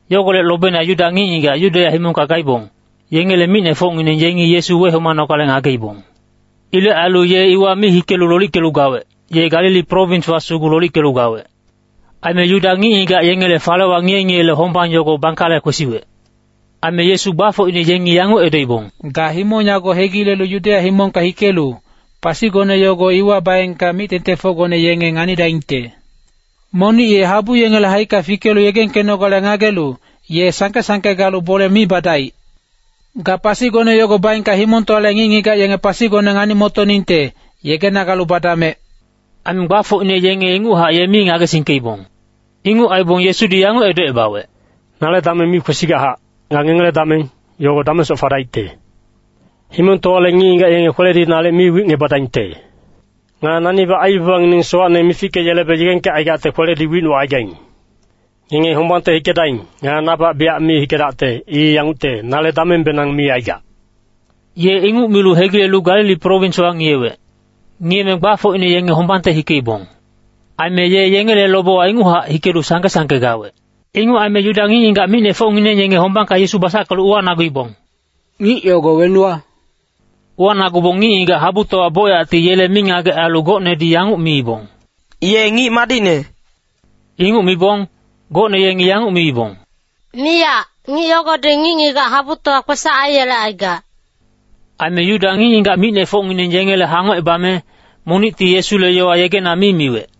Yogolec lobeina Yuda ngic-ngigac Yudeya himongka gaibong, yengele micnefocngineng yengi Yesu wehomanogale ngageibong. Ilec ailu ye iwa mi hikelu lolickelu gawec, ye Galili prowinswa sugu lolickelu gawec. Aime Yuda ngic-ngigac yengele Falewa Ngiye-ngiyele Hombang yogo bangkale kwesiwec. Aime Yesu gbafocine yengi yanguc edoibong, “Ga himong yago hegilelu Yudeya himongka hikelu, pasigone yogo iwa baengka mic-tengtengfocgone yenge nganidaingte. Monic ye habu yengele haicka fikelu yegengkenogale ngagelu, ye sangke-sangke galu bole mi badaic. Ga pasigone yogo baengka himongtowale ngic-ngigac yenge pasigone ngani-motoningte, yegena galu badamec.” Aime gbafocine yenge inguchac ye mi ngagesingkeibong. Inguc aibong Yesudi yanguc edocebawec, “Nale dameng mi kwesigachac. Nga ngengele dameng, yogo damengsoc fadaicte. Himongtowale ngic-ngigac yenge kweledi nalic mi wicngebadaingte. Nga nanibac aibabangineng sowacne mifickeyelebe yegengkecaigacte kweledi wicnucaigaing. Ngenge hombangte hikedaing. Nga nabac biyac mi hikedacte. I yangucte, nale damengbenang mi aigac.” Ye inguc milu hegilelu Galili prowinswa ngiyewec. Ngiyeme gbafocine yenge hombangte hikeibong. Aime ye yengele lobewa inguchac hikelu sangke-sangke gawec. Inguc aime Yuda ngic-ngigac micnefocngineng yenge hombangka Yesu basackelu uwanaguibong, “Ngic yogo wenuwa?” Uwanagubong ngic-ngigac habutowa bocyacti yele mingagec ailu gocnedi yanguc miibong, “Ye ngic madicne.” Inguc mibong, gocne yengi yanguc miibong, “Miyac, ngic yogodi ngic-ngigac habutowa kwesac aiyelecaigac.” Aime Yuda ngic-ngigac micnefocngineng yengele hangocebame, monicti Yesule yowa yegena mi miwec.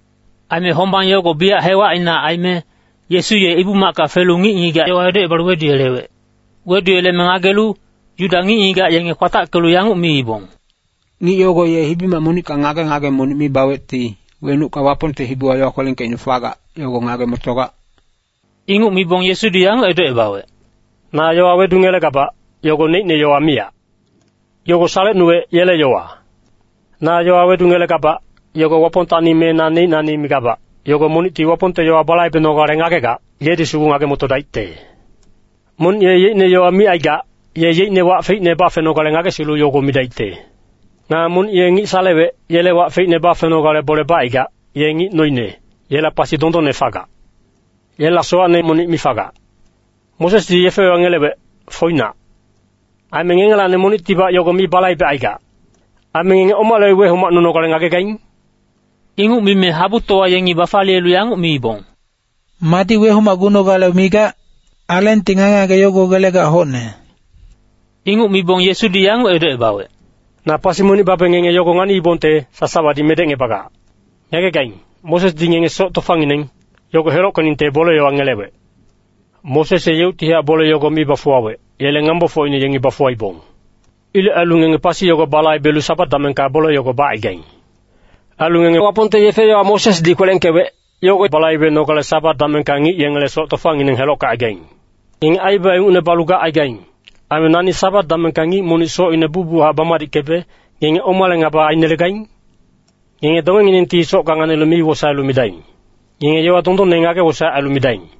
Aime hombang yogo biyac hewacina aime, Yesu ye Ibu-macka felu ngic-ngigac yowa edocebalu weduyelewec. Weduyeleme ngagelu, Yuda ngic-ngigac yenge kwatackelu yanguc miibong, “Ngic yogo ye hibi-mac monicka ngage-ngage monic mi bawecti, wenucka Wapongte hibiwa yowa kwelengkeicne fagac, yogo ngage-motogac?” Inguc mibong Yesudi yanguc edocebawec, “Na yowa wedungelegabac, yogo neicne yowa miyac. Yogo salecnuwec, yele yowa. Na yowa wedungelegabac, yogo Wapongtacni me na neicnacni migabac, yogo monicti Wapongte yowa balaibenogale ngagegac, yedi sugu ngage-motodaicte. Monic ye yeicne yowa micaigac, ye yeicne wac feicne bafenogale ngagesilu yogo midaicte. Nga monic ye ngic salewec, yele wac feicne bafenogale bole bacaigac, ye ngic noine, yela pasi dondonne fagac. Yela sowacne monic mi fagac. “Mosesdi yefe-yowa ngelewec, foinac. Aime ngengelacni monictibac yogo mi balaibecaigac. Ailu ngenge omale wehomacnunogale ngagegaing?” Inguc mime habutowa yengi bafaliyelu yanguc miibong, “Madi wehomacgunogale migac? Alengti ngage-ngage yogo gelegac hocne.” Inguc mibong Yesudi yanguc edocebawec, “Na pasi monic babe ngenge yogo nganiibongte, sasawadi medecngebagac. Ngagegaing, Mosesdi ngenge soc tofangineng, yogo helockeningte bole-yowa ngelewec. Moses ye yeuctihac bole yogo mi bafuwawec, yele ngambofocine yengi bafuwaibong. Ilec ailu ngenge pasi yogo balaibelu Sabat damengka bole yogo bacaigaing. Ailu ngenge Wapongte yefe-yowa Mosesdi kwelengkewec, yogo balaibenogale Sabat damengka ngic yengele soc tofangineng helockecaigaing. Ngenge aibaba ingucne balu gacaigaing. Aime nani Sabat damengka ngic monic socine bucbuchac bamadickebe, ngenge omale ngaba ainelegaing? Ngenge dongenginengti socka nganilu mi wosaelu midaing. Ngenge yowa dondonne ngage-wosaec ailu midaing.”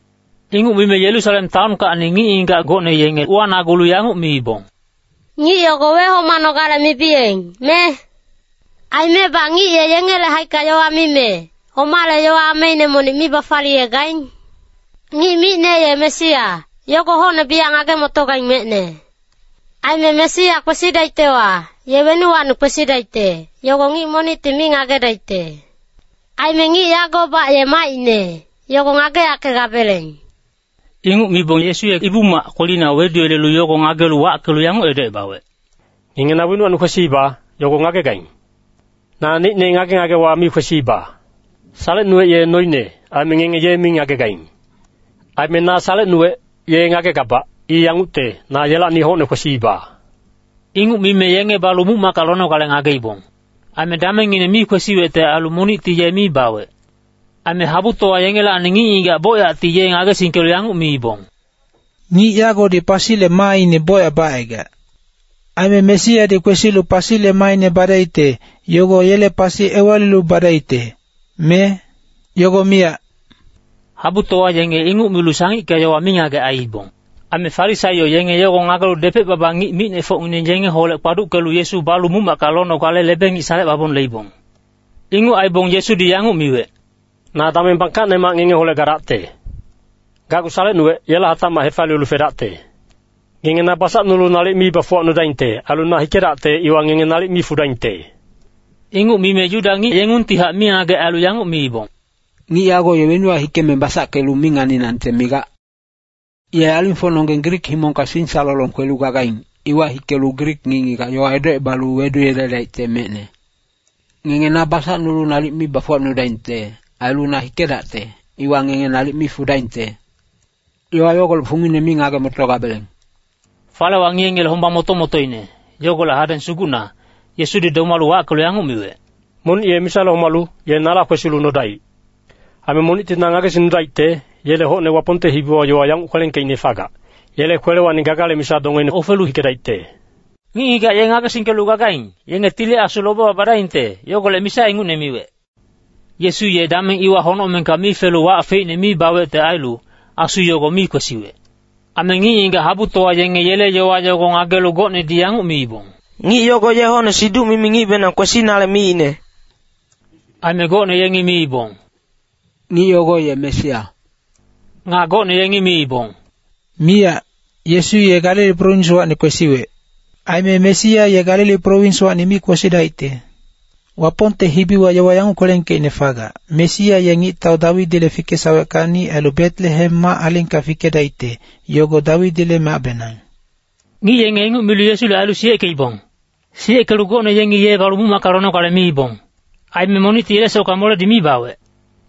Inguc mime Yerusalem taonkacni ngic-ngigac gocne yenge uwanagulu yanguc miibong, “Ngic yogo wehomanogale mibiyeng, me? Aimebac ngic ye yengele haicka yowa mime, omale yowa ameine monic mi bafaliyegaing? Ngic micne ye Mesia, yogo hocne biyac ngage-motogaing mecne. Aime Mesia kwesidaictewa, ye wenuwacni kwesidaicte, yogo ngic monicti mi ngagedaicte. Aime ngic yagobac ye macine, yogo ngageyackegabeleng.” Inguc mibong Yesu ye Ibu-mac kwelina weduyelelu yogo ngagelu wackelu yanguc edocebawec, “Ngenge na wenuwacni kwesiiba, yogo ngagegaing. Naneicne ngage-ngagewa mi kwesiiba. Salecnuwec ye noine, aime ngenge ye mi ngagegaing. Aime na salecnuwec, ye ngagegabac. I yangucte, na yelacni hocne kwesiiba.” Inguc mime yenge balu muc-macka lonogale ngageibong. Aime damengngine mi kwesiwecte ailu monicti ye mi bawec. Aime habutowa yengelacni ngic-ngigac bocyacti ye ngagesingkelu yanguc miibong, “Ngic yagodi pasile maaine bocyac bacaigac. Aime Mesiadi kwesilu pasile maaine badaicte, yogo yele pasi ewalilu badaicte, me? Yogo miyac.” Habutowa yenge inguc milu sangicka yowa mingagec aiibong. Aime Farisaio yenge yogo ngagelu depec-baba ngic micnefocngineng yengeholec kpaduckelu Yesu balu muc-macka lonogale lebe-ngic salecebabong leibong. Inguc aibong Yesudi yanguc miwec, “Na dameng bangkacnemac ngengeholec gadacte. Gacgu salecnuwec, yela hatacmac hefaliyelu fedacte. Ngenge na basacnulu nalic mi bafuwacnudaingte. Ailu na hikedacte, iwa ngenge nalic mi fudaingte.” Inguc mime Yuda ngic yengungtihac mingagec ailu yanguc miibong, “Ngic yago ye wenuwa hikeme basackelu mi nganinangte migac? Ye alingfocnonggeng Grik himongka singsalolong kwelu gagaing, iwa hikelu Grik ngic-ngigac yowa edocebalu weduyeledaicte mecne. ‘Ngenge na basacnulu nalic mi bafuwacnudaingte. Ailu na hikedacte, iwa ngenge nalic mi fudaingte.’ Yowa yogolec fungine mi ngage-motogabeleng.” Falewa Ngiye-ngiyele Hombang moto-motoine yogolec hadeng sugucna, Yesudi domalu wackelu yanguc miwec, “Monic ye misale homalu, ye nala kwesilu nodaic. Aime monicti na ngagesingnudaicte, yele hocne Wapongte hibiwa yowa yanguc kwelengkeicne fagac, ‘Yele kwelewacni gagale misa dongeine ofelu hikedaicte.’” Ngic-ngigac ye ngagesingkelu gagaing, yenge Tili Asu lobewa badaingte, yogolec misa ingucne miwec. Yesu ye dameng iwa honocmengka mi felu wac feicne mi bawecte ailu, Asu yogo mi kwesiwec. Aime ngic-ngigac habutowa yenge yele yowa yogo ngagelu gocnedi yanguc miibong, “Ngic yago ye hocne siduc-mimi ngicbenang kwesinale miicne.” Aime gocne yengi miibong, “Ngic yogo ye Mesia.” Nga gocne yengi miibong, “Miyac, Yesu ye Galili prowinswacni kwesiwec. Aime Mesia ye Galili prowinswacni mi kwesidaicte. Wapongte hibiwa yowa yanguc kwelengkeicne fagac, ‘Mesia ye ngictau Dawidile fikesaweckacni ailu Betelehem mac-alingka fikedaicte, yogo Dawidile macbenang.’” Ngic yenge inguc milu Yesule ailu siyeckeibong. Siyeckelu gocne yengi ye balu muc-macka lonogale miibong. Aime monicti yele socka moledi mi bawec.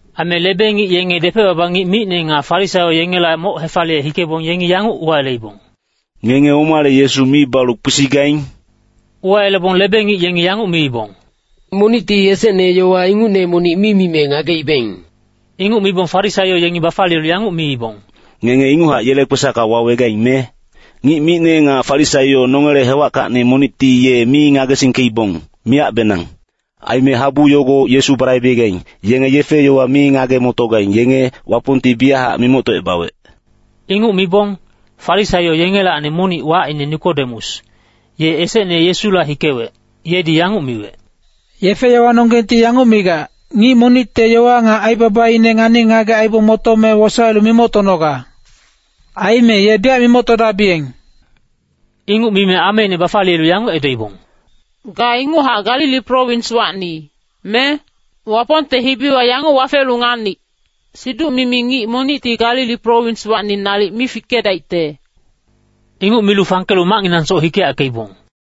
Aime lebe-ngic yenge depec-baba ngic micne nga Farisaio yengela moc hefaliye hikebong yengi yanguc uwayeleibong, “Ngenge omale Yesu mi balu kwesigaing?” Uwayelebong lebe-ngic yengi yanguc miibong, “Monicti esecne yowa ingucne monic mi mime ngageibeng.” Inguc mibong Farisaio yengi bafaliyelu yanguc miibong, “Ngenge inguchac yele kwesacka wawegaing, me? Ngic micne nga Farisaio nongele hewackacni monicti ye mi ngagesingkeibong, miyacbenang. Aime habu yogo Yesu balaibegaing, yenge yefe-yowa mi ngage-motogaing, yenge Wapongti biyachac mimoctocebawec.” Inguc mibong, Farisaio yengelacni monic wacine Nikodemus, ye esecne Yesula hikewec, yedi yanguc miwec, “Yefe-yowanonggengti yanguc migac, ‘Ngic monicte yowa nga aibabaine ngani-ngagec aibong motome wosaelu mimoctonoga.’ Aime ye biyac mimoctogabiyeng.” Inguc mime ameine bafaliyelu yanguc edoibong, “Ga inguchac Galili prowinswacni, me? Wapongte hibiwa yanguc wafelu nganic, siduc-mimi ngic monicti Galili prowinswacni nalic mi fikedaicte.” [Inguc milu fangkelu macnginangsoc hikeyackeibong.